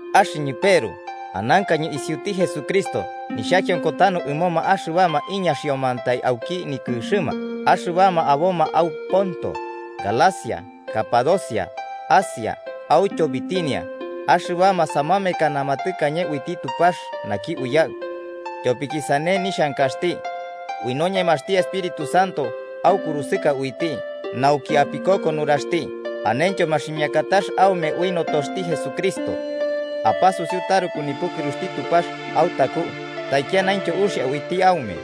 Axɨñɨ Peru, anankañɨ isiuti Jesucristo, nixhakionko tanu ɨmoma axɨbama iñaxiomantai auki nikɨxɨma, axɨbama aboma au Ponto, Galacia, Capadocia, Asia autyo Bitinia, axɨbama samamekanama tɨkañe uiti Tupax naki Uyaɨ tyopiki sane nixhankaxti. Ui noñemaxti Espíritu Santo aukurusɨka uiti nauki apikoko nuraxti anentyo maximiakatax aume ui notoxti Jesucristo. Apasusiu taruku nipukɨruxti Tupax autaku taikianaintyo uxia uiti aume.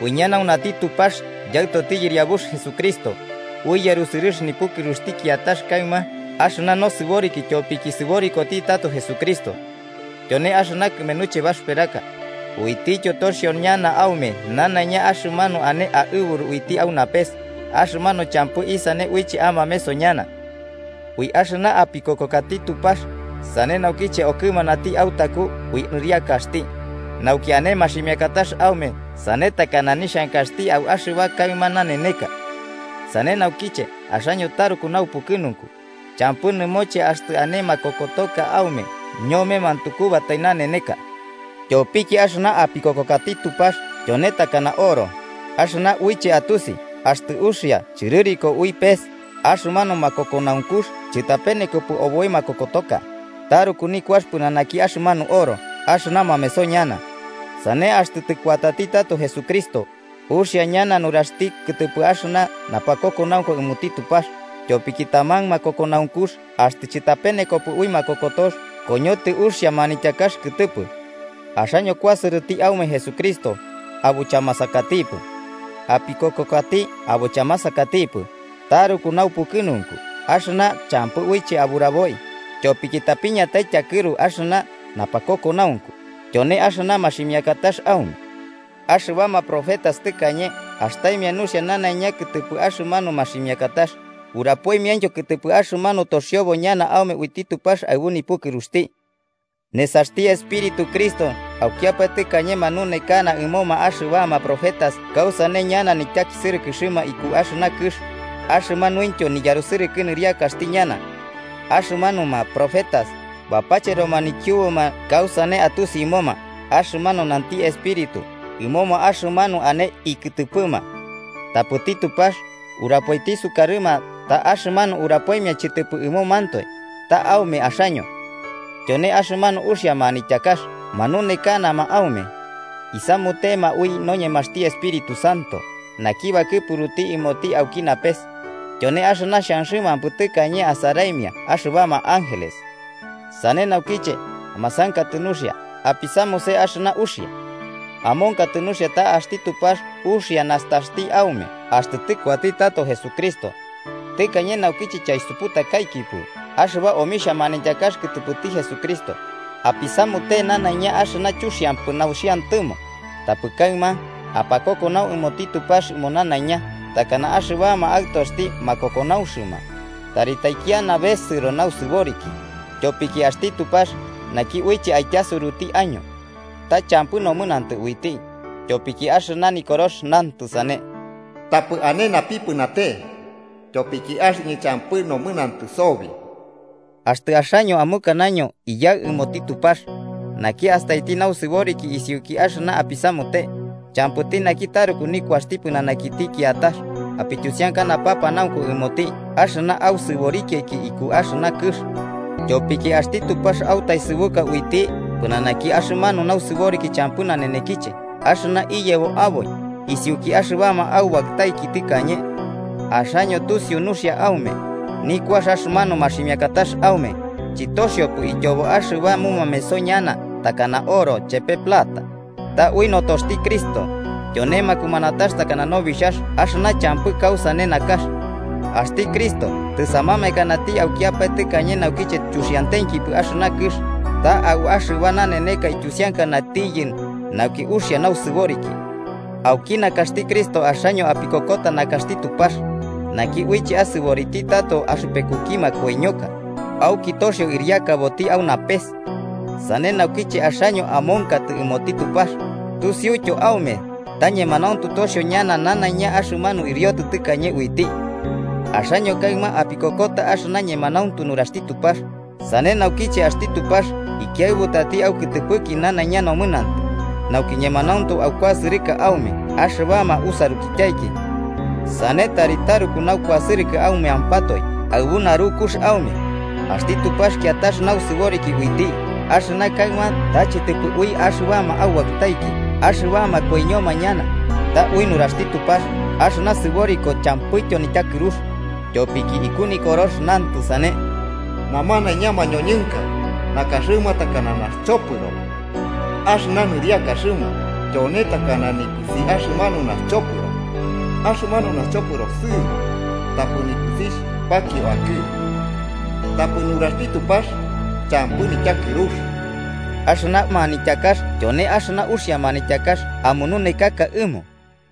Uiñanaunati Tupax Yaɨtoti Yɨriabux Jesucristo, ui yarusɨrɨx nipukɨruxti kiatax kaɨma axɨna nosɨboriki tyopiki sɨborikoti tato Jesucristo. Tyone axɨna kɨmenuche baxɨperaka, uitityo toxio ñana aume nanaiña axɨmanu ane aɨburu uiti au napes, axɨmanu champɨ isane uiche amameso ñana. Ui axɨna apikokokati Tupax, sane naukiche okɨmanati autaku ui nɨriakaxti, nauki ane maximiakatax aume sane takana nixhankaxti au axɨba kaɨma naneneka. Sane naukiche axaño taruku naupukɨnunku, champɨ nɨmoche axtɨ ane makokotoka aume ñome mantukubatai naneneka. Tyopiki axɨna apikokokati Tupax tyone takana oro: axɨna uiche atusi axtɨ uxia chɨrɨriko ui pes, axɨmanu makokonaunkux chɨtapenekopɨ oboi makokotoka, taruku nikuax pɨnanaki axɨmanu oro, axɨna mameso ñana. Sane axtɨ tɨkuatati tato Jesucristo, uxia ñana nuraxti kɨtɨpɨ axɨna napakokonaunku ɨmoti Tupax, tyopiki taman makokonaunkux axtɨ chɨtapenekopɨ ui makokotox koñotɨ uxia manityakax kɨtɨpɨ. Axaño kuasɨrɨti aume Jesucristo, abo chamasakatipɨ. Apikokokati abo chamasakatipɨ, taruku naupukɨnunku, axɨna champɨ uiche aburaboi, tyopiki tapiñatai tyakɨru axɨna napakokonaunku, tyone axɨna maximikatax aume. Axɨbama profetas tɨkañe astaimia nuxia nanaiña kɨtɨpɨ axɨmanu maximiakatax, urapoimiaintyo kɨtɨpɨ axɨmanu toxiobo ñana aume uiti Tupax aɨbu nipukɨruxti. Nesaxti Espíritu Cristo aukiapae tɨkañe manunekana ɨmoma axɨbama profetas kausane ñana nityakisɨrɨkɨxti iku axɨna kɨx, axɨmanuintyo niyarusɨrɨkɨ nɨriakaxti ñana. Axɨmanuma profetas, bapacheroma nikiubuma kausane atusi ɨmoma axɨmanu nanti Espíritu ɨmoma axɨmanu ane ikɨtɨpɨma. Tapɨti Tupax urapoiti sukarɨma ta axɨmanu urapoimia chɨtɨpɨ ɨmomantoe, ta aume axaño. Tyone axɨmanu uxia manityakax manunekanama aume. Isamutema ui noñemaxti Espíritu Santo, naki bakɨpukux ɨmoti auki napes. ¡Tyone axɨna xhanxɨmampɨ tɨkañe asaraimia axɨbama ángeles! Sane naukiche, amasankatɨ nuxia, apisamuse axɨna uxia. Amonkatɨ nuxia ta axti Tupax uxia nastaxti aume axtɨ tɨkuati tato Jesucristo. Tɨkañe naukiche chausuputakaikipɨ axɨba omixhia manityakax kɨtɨpɨti Jesucristo, apisamute nanaiña axɨna chuxiampɨ nauxiantɨmo. Tapɨ kaɨma, apakokonau ɨmoti Tupax ɨmo nanaiña, takana axɨbama aɨtoxti makokonaunxɨma. Tari taikiana besɨro nausɨboriki, tyopiki axti Tupax, naki uiche aityasuruti año, ta champɨ nomɨnantɨ uiti. Tyopiki axɨna Nikorox nantɨ sane: “Tapɨ ane napipɨnate, tyopiki axɨñɨ champɨ nomɨnantɨ sobi.” Axtɨ axaño amukanaño “Iyaɨ” ɨmoti Tupax, naki astaiti nausɨboriki isiuki axɨna apisamute, champɨti naki taruku nikuaxti pɨnanakiti kiatax, apityusiaka napanaunku ɨmoti axɨna ausɨborikiaiki iku axɨna kɨx. Tyopiki axti Tupax autaesɨbu uiti pɨnanaki axɨmanu nausɨboriki champɨ nanenekiche axɨna iyebo aboi isiuki axɨbama aubaɨtaiki tɨkañe. Axaño tusiu nuxia aume, nikuax axɨmanu maximiakatax aume, chɨtoxiopɨ ityobo axɨba mumameso ñana takana oro chepe plata, ta ui notoxti Cristo, tyone makumanatax takana nobixhax axɨna champɨ kausane nakax. Axti Cristo tɨsamamekanati aukiapae tɨkañe naukiche chuxiantenkipɨ axɨna kɨx, ta au axɨba naneneka ityusiankanatiyɨ nauki uxia nausɨboriki. Auki nakaxti Cristo axaño apikokota nakaxti Tupax, naki uiche asɨboriti tato axɨpekuki makoiñoka, auki toxio ɨriakaboti au napes. Sane naukiche axaño amonkatɨ ɨmoti Tupax, tusiuityo aume ta ñemanauntu toxio ñana nanaiña axɨmanu ɨriotɨ tɨkañe uiti. Axaño kaɨma apikokota axɨna ñemanauntu nuraxti Tupax, sane naukiche axti Tupax ikiaɨbutati aukɨtɨpɨki nanaiña nomɨnantɨ, nauki ñemanauntu akuasɨrɨma aume axɨbama usarukityaiki. Sane tari taruku naukuasɨrɨkɨ aumeampatoe aɨbu narukux aume. Axti Tupax kiatax nausɨboriki uiti, axɨna kaɨma ta chɨtɨpɨ ui axɨbama aubaɨtaiki axɨbama koiñoma ñana, ta ui nuraxti Tupax axɨna sɨboriko champɨityo nityakɨrux. Tyopiki iku Nikorox nantɨ sane: “Namanaiña mañoñɨnka nakaxɨma takana naxchopɨro, axɨna nɨriakaxɨma tyone takana nipɨsi axɨmanu naxchopɨro. Axɨmanu naxchopɨro sɨɨbo tapɨ nipɨsixh pakio akɨ, tapɨ nuraxti Tupax champɨ nityakɨrux.” Axɨna manityakax tyone axɨna uxia manityakax amununekaka ɨmo.